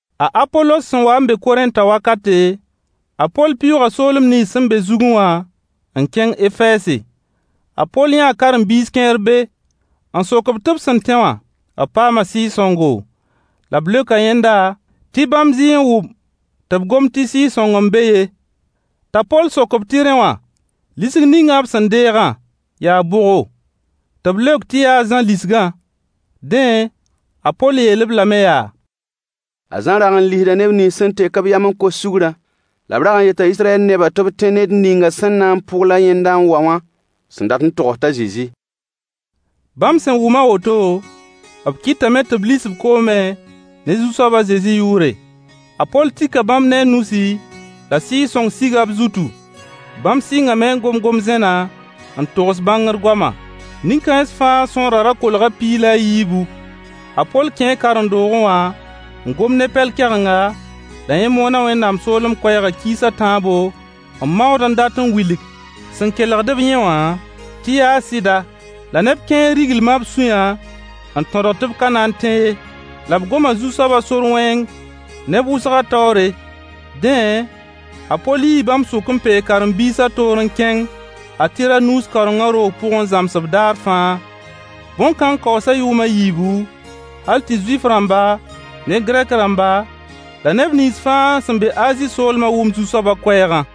A Apolos sẽn wa n be Korẽntã wakate, a Poll pɩʋʋga soolem nins sẽn be zugẽ wã n kẽng Efɛɛse. A Poll yãa karen-biis kẽer be, n sok-b tɩ b sẽn tẽ wã, b paama Sɩɩg-sõngo. La b leoka yẽnda tɩ bãmb zɩɩ n wʋm tɩ b gomd tɩ Sɩɩg-sõng n be ye. T'a Poll sok-b tɩ rẽ wã lisg ninga b sẽn deegã yaa bʋgo? Tɩ b leok tɩ yaa a Zã lisgã. Dẽ, a Poll yeel-b lame yaa: A Zã rag n lisda neb nins sẽn tek-b yam n kos sugrã, la b rag n yeta Israyɛl nebã tɩ b tẽ ned ningã sẽn na n pʋgl a yẽnda n wa wã. Sẽn dat n togs t'a Zezi. Bãmb sẽn wʋm a woto, b kɩtame tɩ b lis-b koomẽ ne Zu-soab a Zezi yʋʋre. A Poll tika bãmb ne a nusi, la Sɩɩg-sõng siga b zutu. Bãmb sɩngame n gom gom-zẽna n togs bãngr goama. Nin-kãens fãa sõorã ra kolga piig la a yiibu. A Poll kẽe karen-doogẽ wã n gom ne Pɛl-kɛgenga, la yẽ moona Wẽnnaam soolem koɛɛgã kiis a tãabo n maood n dat n wilg sẽn kelgd-b yẽ wã tɩ yaa sɩda. La neb kẽer riglima b sũyã n tõgdg tɩ b ka na n tẽ ye. La b gom Zu-soaba sor wẽng neb wʋsgã taoore. Dẽ, a Poll yii bãmb sʋk, n peeg karen-biisã toor n kẽng a Tiranuus kaorengã roog pʋg n zãms-b daar fãa. Bõn-kãng kaoosa yʋʋm a yiibu, hal tɩ Zuif-rãmba ne Gɛrk-rãmba la neb nins fãa sẽn be Azi soolma wʋm Zu-soabã koɛɛgã.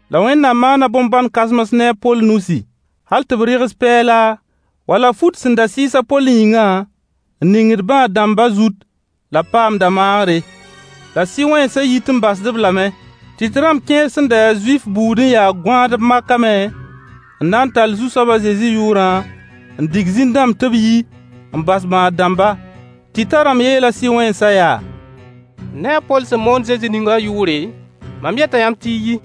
La Wẽnnaam maana bõn-bãn-kãsems ne a Poll nusi. Hal tɩ b rɩgs pɛɛla wala fut sẽn da sɩɩs a Poll yĩngã n ningd bãad-dãmba zut la b paamda maagre, la sɩ-wẽnsã yit n basd-b lame. Tɩt rãmb kẽer sẽn da ya Zuif buud n ya gõaadb makame n na tall Zu-soab a Zezi yʋʋrã n dig zĩn-dãmb tɩ b yi n bas bãad-dãmba. Tɩtã rãmb yeela sɩ-wẽnsã yaa: Ne a Poll sẽn moond Zezi ningã wã yʋʋre, mam yeta yãmb tɩ y yi.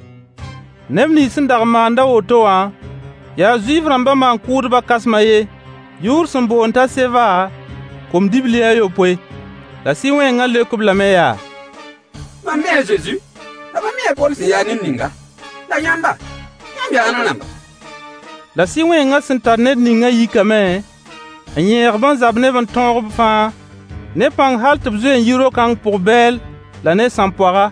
Neb nins sẽn dag n maand a woto wã yaa Zuif-rãmba maan-kʋʋdbã kãsem a yen yʋʋr sẽn boond t'a Seva kom-dibli a yopoe. La sɩ-wẽnga leok-b lame yaa: Mam mii a Zezi, la m mii a Poll sẽn ya ned ninga. La yãmba, yãmb yaa ãnna rãmba? La sɩ-wẽngã sẽn tar ned ningã yikame n yẽeg-b n zab ne-b n tõog-b fãa ne pãng hal tɩ b zoe n yi ro-kãng pʋg bɛɛl la ne sãmpoaga.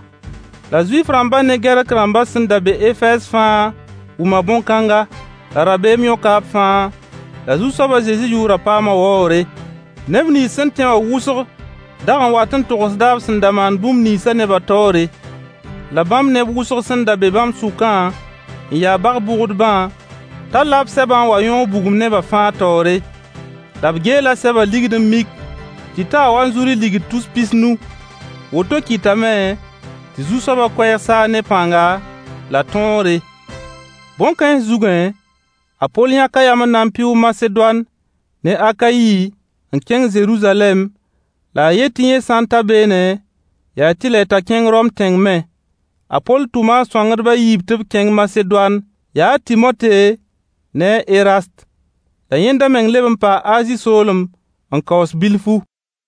La Zuif-rãmba ne Gɛrk-rãmba sẽn da be Efɛɛs fãa wʋma bõn-kãnga: La rabeem yõka b fãa, la Zu-soab a Zezi yʋʋrã paama waoogre. Neb nins sẽn tẽ wã wʋsg dag wat n togsda b sẽn da maan bũmb ninsã neba taoore. La bãmb neb wʋsg sẽn da be bãmb sʋkã n ya bag-bʋgdbã talla b sɛbã n wa n yõog bugum neba fãa taoore. La b geela sɛba ligd n mik tɩ taa wanzuri ligd tus pis nu. Woto kɩtame tɩ Zu-soaba koɛɛg saag ne pãnga la tõogre. Bõn-kãens zugẽ, a Poll yãka yam n na pɩʋʋg Masedoan ne Akayi n kẽng Zeruzalɛm, la a yet tɩ yẽ sã n ta beene, yaa tɩlɛ t'a kẽng Rom tẽng me. A Poll tʋma a sõangdb a yiib tɩ b kẽng Masedoan, yaa a Tɩmote ne a Erast. La yẽnda meng leb n paa Azi soolem n kaoos bilfu.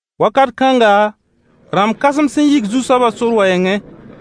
Wakat kãnga, rãmb-kãsems n yik Zu-soabã sor wɛɛngẽ.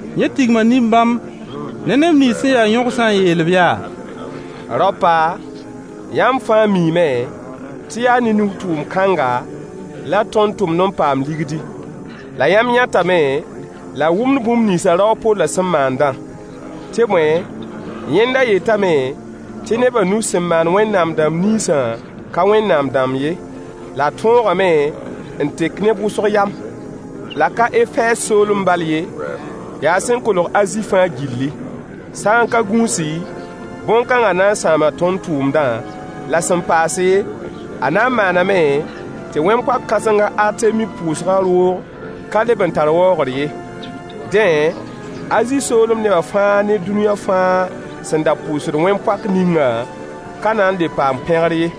Yẽ tigma nin-bãmb ne neb nins sẽn ya yõgsã n yeel-b yaa: Raopa, yãmb fãa miime tɩ yaa ne nug-tʋʋm kãngã la tõnd tʋmd n paamd ligdi. La yãmb yãtame la y wʋmd bũmb nins rao a Pollã sẽn maandã. Tɩ bõe, yẽnda yetame tɩ neba nus sẽn maan wẽnnaam-dãmba ninsã ka wẽnnaam-dãmb ye, la a tõogame n tek neb wʋsg yam. La ka Efɛɛs soolem bal ye, yaa sẽn kolg Azi fãa gilli. Sã n ka gũusi, bõn-kãnga na n sãama tõnd tʋʋmdã, la sẽn paase, a na n maaname tɩ wẽn-poak kãseng a Artemi pʋʋsgã roog ka leb n tar waoogr ye. Dẽ, Azi soolem nebã fãa ne dũniyã fãa sẽn da pʋʋsd wẽn-poak ninga ka na n le paam pẽgr ye.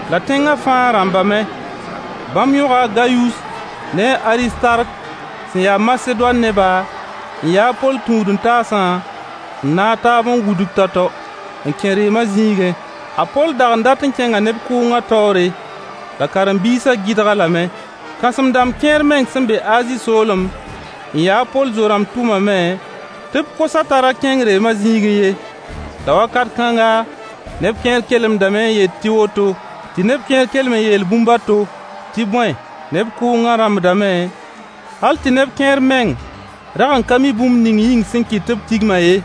La tẽnga fãa rãmbame. Bãmb yõga Gayus ne a Aristark sẽn ya Masedoan neba n yaa a Poll tũud-n-taasã, n naag taab n wudg tao-tao n kẽ reema zĩigẽ. A Poll dag n dat n kẽnga neb kʋʋngã taoore, la karen-biisã gɩdg-a lame. Kãsem-dãmb kẽer meng sẽn be Azi soolem n ya a Poll Zo-rãmb tʋmame tɩ b kos-a t'a ra kẽng reema zĩigẽ ye. La wakat kãnga, neb kẽer kelemdame n yet tɩ woto, tɩ neb kẽer kelem n yeel bũmb a to. Tɩ bõe, neb kʋʋngã rãmbdame, hal tɩ neb kẽer meng rag ka mi bũmb ning yĩng sẽn kɩt tɩ b tigma ye.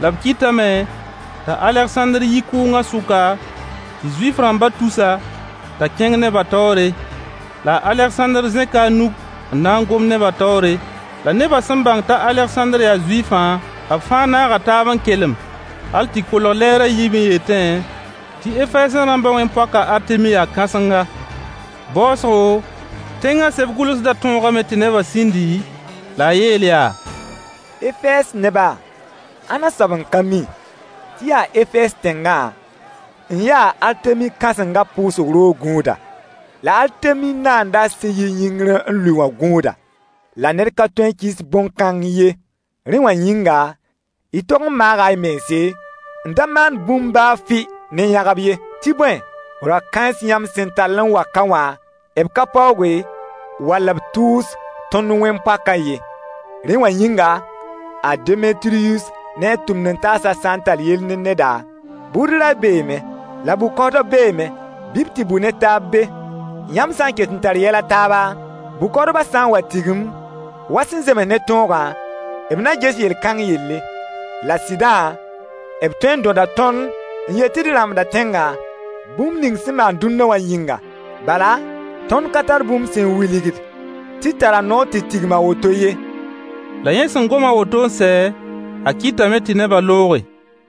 La b kɩtame t'a Alegsãndr yi kʋʋngã sʋka, tɩ Zuif-rãmba tus-a t'a kẽng neba taoore. La a Alegsãndr zẽka a nug n na n gom neba taoore. La neba sẽn bãng t'a Alegsãndr yaa Zuifã, b fãa naaga taab n kelem hal tɩ kolg lɛɛr a yiib n yetẽ tɩ Efɛɛsẽ rãmbã wẽn-poak a Artemi yaa kãsenga. Baoosgo, tẽnga seb-gʋlsdã tõogame tɩ neba sĩndi, la a yeel yaa: Efɛɛs neba, ãnna soab n ka mi tɩ yaa Efɛɛz tẽngã n ya Artemi kãsenga pʋʋsg roog gũuda, la Artemi naandã sẽn yi yĩngr n lʋɩ wã gũuda? La ned ka tõe n kɩɩs bõn-kãng ye. Rẽ wã yĩnga, y tog n maaga y mense n da maan bũmb baa fʋɩ ne yãgb ye. Tɩ bõe, rao-kãens yãmb sẽn tall n wa ka wã, b ka paooge, wala b tʋʋs tõnd wẽn-poakã ye. Rẽ wã yĩnga, a Demetiryus ne a tʋmd-n-taasã sã n tar yell ne neda, bʋʋd ray beeme, la bʋ-kaoodb beeme. Bɩ b tɩ bʋ ne taab be. Yãmb sã n ket n tar yɛl a taaba, bʋ-kaoodbã sã n wa tigim wa sẽn zems ne tõogã, b na ges yel-kãng yelle. La sɩdã, b tõe dõda tõnd n yet tɩ d rãmbda tẽngã, bũmb ning sẽn maan dũnna wã yĩnga. Bala, tõnd ka tar bũmb sẽn wilgd tɩ d tara noor tɩ tigim a woto ye. La yẽ sẽn gom a woto n sɛ, a kɩtame tɩ nebã looge.